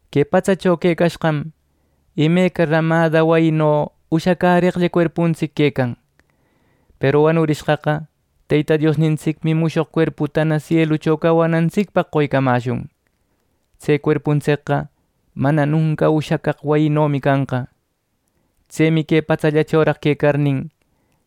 Que patsacho quecashqam imeca rämada wayino ushacäreqlla cuerpuntsic quecan. Peru wanurishqaqa Teyta Diosnintsicmi mushoq cuerputana sielucho cawanantsicpaq qoycamäshun. Tse cuerpuntsicqa mana nunca ushacaq wayinomi canqa. Tsemi que patsachoraq quecarnin,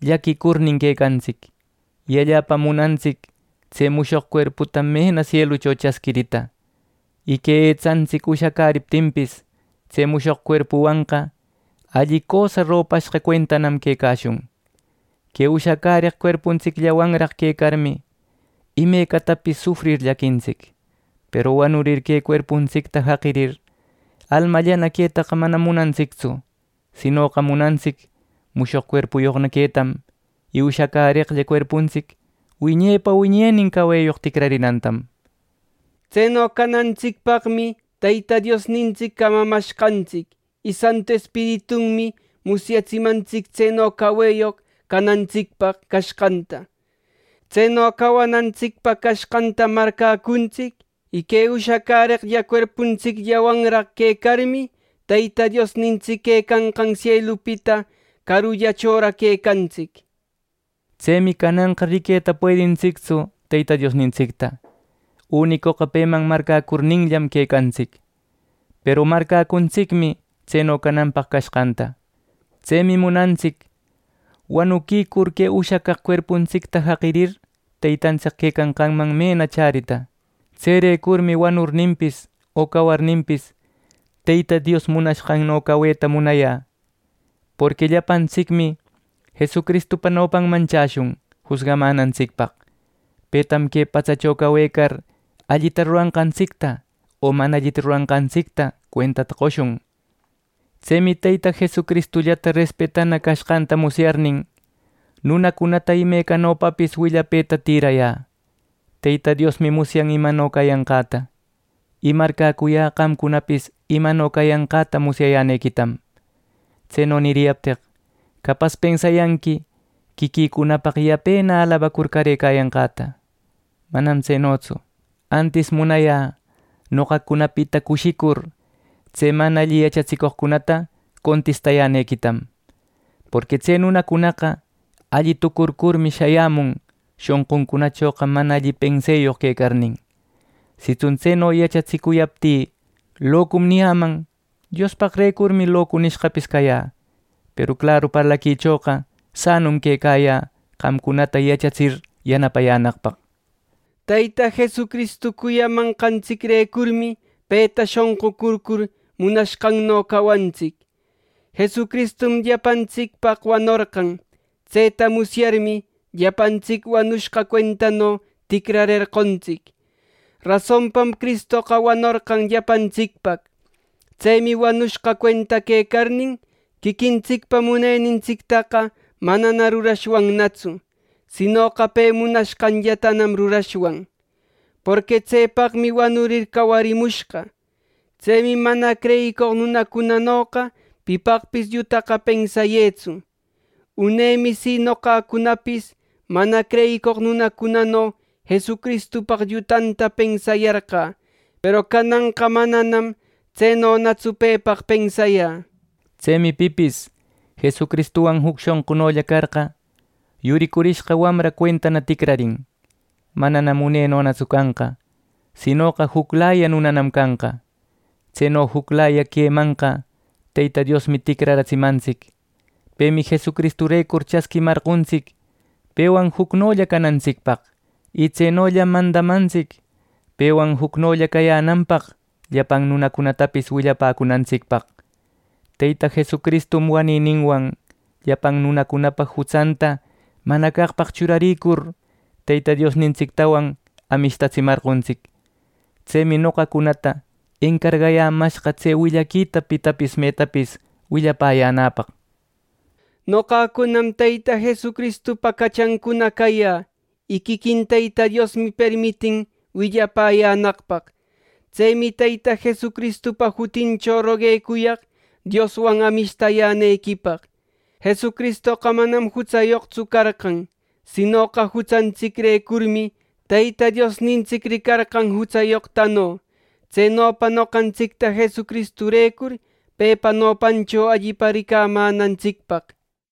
llaquicurnin quecantsic, y allapam munantsic tse mushoq cuerputa mena sielucho chasquirita. Y que etsantsic ushacäriptinpis, tse mushoq cuerpuwanqa alli cösa ropashqa cuentanam quecashun. Que ushacäreq cuerpuntsicllawanraq quecarmi, imecatapis sufrir llaquintsic. Peru wanurir que cuerpuntsicta jaqirir, almallana queta manam munantsictsu; sinoqa munantsic mushoq cuerpuyoqna quetam. Y ushacäreqlla cuerpuntsic wiñepa wiñenin caweyoq ticrarinantam. Tseno canantsicpaqmi Teyta Diosnintsic camamashqantsic. Y Santu Espiritunmi musyatsimantsic tseno caweyoq canantsicpaq cashqanta. Tseno cawanantsicpaq cashqantam marcäcuntsic. Y que ushacäreqlla cuerpuntsicllawanraq quecarmi, Teyta Diosnintsic quecanqan sielupita carullachoraq quecantsic. Tsemi cananqa riqueta puedintsictsu Teyta Diosnintsicta. Unicoqa peman marcäcurninllam quecantsic. Peru marcäcuntsicmi tseno canapaq cashqanta. Tsemi munantsic wanuquicur que ushacaq cuerputa jaqirir, Teytantsic quecanqanman mena chärita. Tserecurmi wanurninpis o cawarninpis, Teyta Dios munashqanno caweta munayä; porqui llapantsicmi Jesucristupa nopanman chäshun jusgamänantsicpaq. Petam que patsacho cawecar allita ruranqantsicta o mana allita ruranqantsicta cuentata qoshun. Tsemi Teyta Jesucristullata respetana cashqanta musyarnin, nunacunata imecanopapis willapëta tïrayä. Teyta Diosmi musyan imano cayanqäta. Y marcäcuyä qamcunapis imano cayanqäta musyayänequitam. Tseno niriyapteq, capas pensayanqui quiquïcunapaq yapena alabacur carëcayanqäta. ¡Manam tsenotsu! Antis munayä noqacunapita cushicur, tse mana alli yachatsicoqcunata contistayänequitam. Porqui tse nunacunaqa alli tucurcurmi shayämun, shonquncunachoqa mana alli penseyoq quecarnin. Sitsun tseno yachatsicuyaptï “Locum” niyäman, Diospaqrecurmi “Locu” nishqapis cayä; peru claru parlaquichoqa sanum quecayä qamcunata yachatsir yanapayänaqpaq. Teyta Jesucristu cuyamanqantsicrecurmi peta shonqucurcur munashqanno cawantsic. Jesucristum llapantsicpaq wanorqan. Tseta musyarmi, llapantsic wanushqa cuentano ticrarerqontsic. Rasonpam Cristoqa wanorqan llapantsicpaq. Tsemi wanushqa cuenta quecarnin, quiquintsicpa munenintsictaqa manana rurashwannatsu; sinoqa pe munashqanllatanam rurashwan. Porqui tsepaqmi wanurir cawarimushqa. Tsemi mana creyicoq nunacunanoqa pipaqpis llutaqa pensayätsu. Unemi si, noqacunapis mana creyicoq nunacunano Jesucristupaq llutata pensayarqä. Peru cananqa mananam tsenonatsu pepaq pensayä. Tsemi pipis Jesucristuwan juc shonqunolla carqa, yuricurishqa wamra cuenta ticrarin. Mananam unenonatsu canqa; sinoqa juclaya nunanam canqa. Tseno juclaya quemanqa Teyta Diosmi ticraratsimantsic. Pemi Jesucristurecur chasquimarqontsic pewan jucnolla canantsicpaq, y tsenollam mandamantsic pewan jucnolla cayänanpaq llapan nunacunatapis willapäcunantsicpaq. Teyta Jesucristum wanininwan llapan nunacunapa jutsanta mana caqpaq churarïcur Teyta Diosnintsictawan amishtatsimarqontsic. Tsemi noqacunata encargayämashqa tse willaquita pitapis metapis willapäyänäpaq. Noqacunam Teyta Jesucristupa cachancuna cayä, y quiquin Teyta Diosmi permitin willapäyänaqpaq. Tsemi Teyta Jesucristupa jutincho roguecuyaq, Dioswan amishtayänequipaq. Jesucristoqa manam jutsayoqtsu carqan, sinoqa jutsantsicrecurmi Teyta Diosnintsic ricarqan jutsayoqtano, tsenopa noqantsicta Jesucristurecur pepa nopancho allipa ricamänantsicpaq.